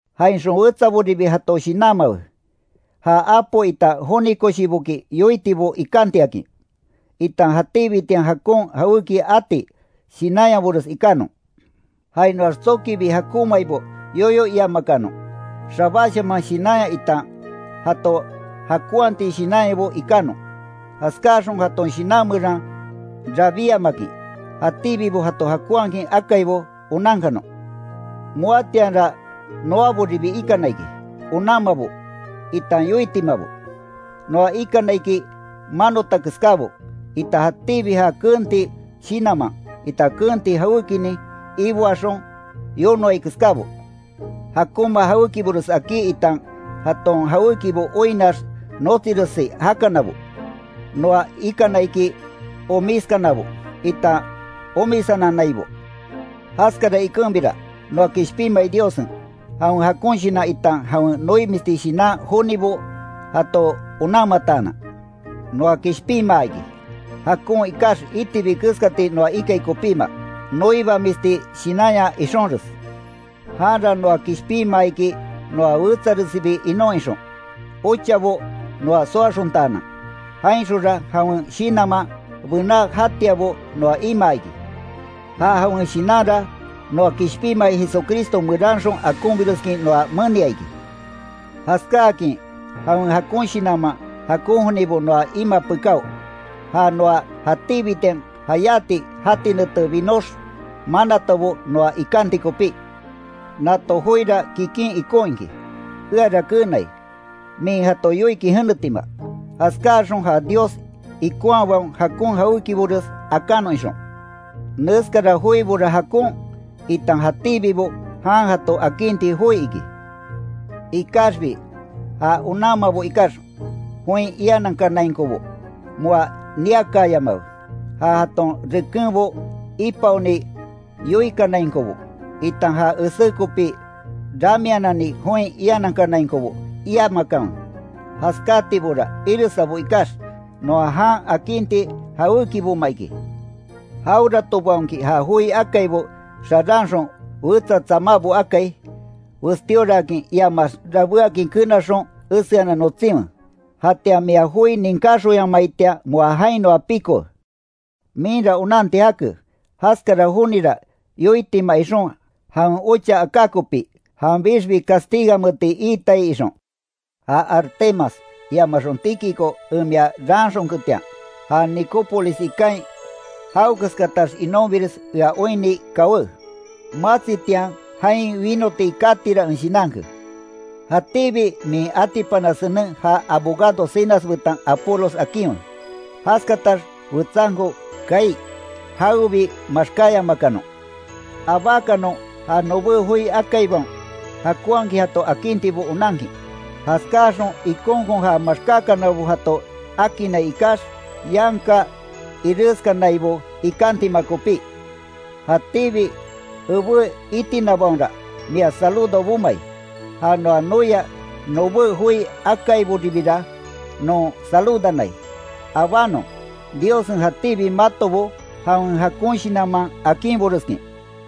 Jainxon wetsaboribi jato shinanmawe, ja Apo itan joni koshiboki yoitibo ikantiakin, itan jatíbitian jakon jawéki ati shinanyabores ikanon. Jainoax tsokibi jakonmaibo yoyo iamakanon, xabáshaman shinanya itan jato jakonhati shinanyabo ikanon, jaskaxon jaton shinan meran rabíamakin, jatíbibo jato jakonhakin akaibo onankanon. Moatianra noaboribi ikana iki, onanmabo, itan yoitimabo. Noa ikana iki manota keskábo, itan jatíbi ja keenti shinanman, itan keenti jawékinin iboaxon yonoai keskábo. Jakonma jawékibores akí itan jaton jawékibo oinnax notsiresi jakanabo. Noa ikana iki omiskanabo, itan omisananaibo. Jaskara ikenbira noa kishpinmai Diossen, jawen jakon shinan itan jawen noimisti shinan jonibo jato onanmataanan, noa kishpinmaa iki. Jakon ikax itibi keskati noa ikai kopíma, noibamisti shinanya ixonres. Janra noa kishpinmaa iki noa wetsaresibi inon ixon, ochabo noa soaxontaanan, jainxonra jawen Shinanman bená jatiabo noa imaa iki. Ja jawen Shinanra, noa kishpinmai Jesucristo meranxon akonbireskin noa menia iki. Jaskáakin jawen jakon shinanman jakon jonibo noa imaa pekáo, ja noa jatíbitian jayáti jati nete binox manatabo noa ikanti kopí. Nato joira kikin ikon iki, eara keenai, min jato yoikin jenetima. Jaskáaxon ja Dios ikonhabaon jakon jawékibores akanon ixon. Neskara joibora jakon, itan jatíbibo jan jato akinti joi iki. Ikaxbi ja onanmabo ikax join ianankanainkobo moa niakaayamawe, ja jaton rekenbo ipaoni yoikanainkobo, itan ja esé kopi ramianani join ianankanainkobo iamakanwe. Jaskátibora iresabo ikax, noa jan akinti jawékiboma iki. Jaweratobaonki ja joi akaibo xaranxon wetsa tsamábo akai, westíoraakin iamaax rabéakin kenaxon eseanan notsinwe. Jatian mia joi ninkáxonyamaitian moa jainoa pikowe. Minra onanti jake, jaskara jonira yoitima ixon jawen ocha aká kopi, janbixbi castiganmeeti iitai ixon. Ja Artemas iamaxon Tíquico en mia raanxonketian, ja Nicópolis ikain jawekeskatax inonbires ea oinni kawé; matsitian jain wínoti katira en shinanke. Jatíbi min atipana senen ja abogado Zenas betan Apolos akinwe. Jaskatax wetsanko kaai, jawebi maxkáyamakanon. Abákanon ja nobé joi akaibaon jakonhakin jato akintibo onankin. Jaskáxon ikonkon ja maxkákanabo jato akinnai ikax, yanka ireskanaibo ikantima kopí. Jatíbi ebé itinabaonra mia saludo bomai, ja noa noia nobé joi akaiboribira non saludanai. Abánon, Diossen jatíbi matobo jawen jakon shinanman akinboreskin.